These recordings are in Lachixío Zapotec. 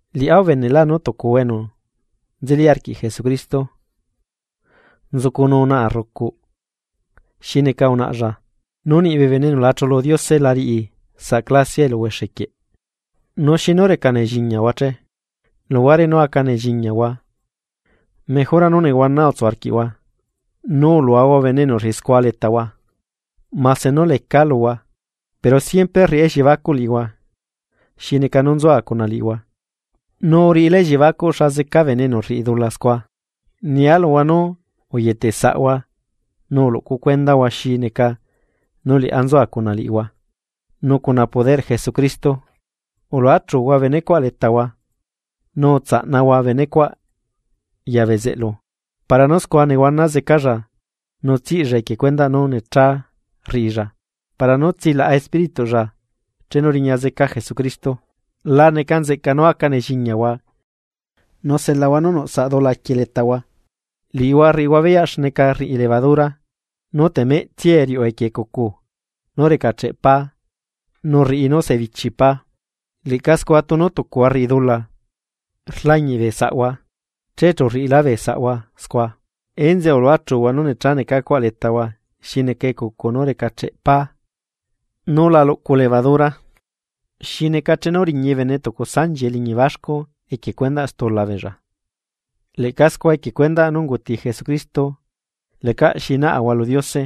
Liꞌá ubenelaa nú tucuhua enu nzeli arquiꞌ Jesucristo nzucunuu naa rrucuꞌ xi neca unaꞌlla, nu niꞌ bee bene enu la chulu Diose la riꞌi saꞌ clasiaꞌ eluhuexe quieꞌ. Nu xinu reca nelliñiahua che, luhuare nú aca nelliñiahua, mejora nú nehuana utsu arquiꞌhua nu uluahua bene enu rriꞌi scua letahua. Mase nú lecaa luhua, pero siempre rriꞌá elliebacuꞌ liꞌihua, xi neca nú nzua cuna liꞌihua, nu uriꞌilá elliebacuꞌ xa zeca bene enu rriꞌi dula scua. Nia luhua nú uyetesaꞌhua nu uluꞌcu cuendahua xi neca nú liꞌá nzua cuna liꞌihua nu cuna poderꞌ Jesucristo. Uluachuhua benecuaꞌ letahua. Nu utsaꞌnahua benecuaꞌ ya bezeꞌlu para nú scua nehuana zecalla nu tsiꞌlla equie cuendaꞌ nú necha rriꞌilla para nú tsilaꞌa espírituꞌlla chenu riña zeca Jesucristo. La neca nzeꞌca nú aca nelliñiahua nu selahua nú nuꞌ saꞌ dula quie letahua, liꞌihua rriꞌihua beyaꞌ xneca rriꞌi levadura nú temeꞌtsiae riuꞌu equie ecucu nú recacheꞌ pá nu rriꞌi nú sebichi pá. Leꞌca scua tunu tucuhua rriꞌi dula rlañiꞌ bee saꞌhua, che chu rriꞌilá bee saꞌhua scua. Enzeꞌe uluachuhua nú necha necacuaꞌ letahua xi neca ecucu nú recacheꞌ pá nú la luꞌcu levadura. Xi neca chenu riñi bene tucu sanchi eliñi baxcu equie cuendaꞌ stula beella, leꞌca scua equie cuendaꞌ nú unguti Jesucristo, lecaꞌ xi naꞌahua lu Diose.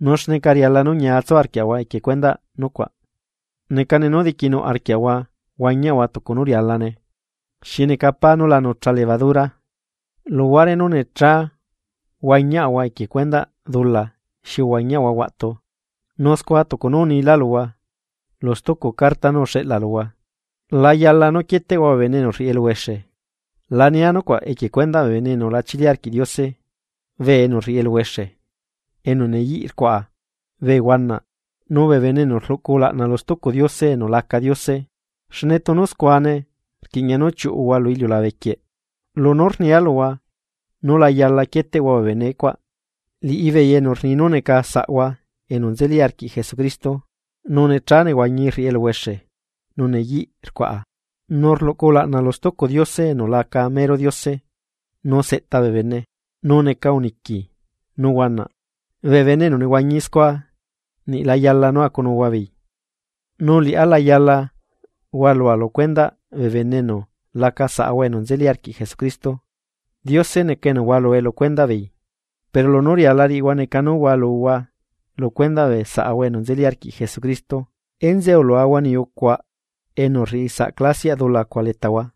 Nu xneca riala nú ñiatsu arquiaꞌahua equie cuendaꞌ nucuaꞌ, necane nú diquinuꞌ arquiaꞌahua huañiaꞌahua tucu nú rialane, xi neca pá nú la nucha levadura, luhuare nú necha huañiaꞌahua equie cuendaꞌ dula xi uhuañiaꞌahua huaꞌtu. Nu scua tucu nú unilá luhua lu stucu carta nú uxeꞌla luhua, la yala nú quieteꞌhua bee bene enu rriꞌi eluhuexe. La nia nucuaꞌ equie cuendaꞌ bee bene enu la chili arquiꞌ Diose, bee enu rriꞌi eluhuexe, enu neyiꞌ rcuaꞌa, bee huanaꞌ nu bee bene enu rluꞌcu ulaꞌna lu stucu diose enu laca Diose, xne tunu scuane rquiña nú chiuꞌuhua lu iliulabe quieꞌ. Lunú rnia luhua nú la yala quieteꞌhua bee bene cuaꞌ, liꞌibeei enu rni nú neca saꞌhua enu nzeli arquiꞌ Jesucristo, nu necha nehuañi rriꞌi eluhuexe nu neyiꞌ rcuaꞌa, nu rluꞌcu ulaꞌna lu stucu diose enu laca mero Diose nu seꞌta bee bene, nu neca uniqui nu huanaꞌ, bee bene enu nehuañi scua, niꞌla yala nú acunuhua beei. Nu liꞌá la yala hualua lu cuendaꞌ bee bene enu laca saꞌahua enu nzeli arquiꞌ Jesucristo, Diose neca enu hualue lu cuendaꞌ beei. Pero lunú riala riꞌihua neca nú hualuhua lu cuendaꞌ bee saꞌahua enu nzeli arquiꞌ Jesucristo. Enzeꞌe uluahua niyucuaꞌ enu rriꞌi saꞌ clasiaꞌ dula cuaꞌ letahua.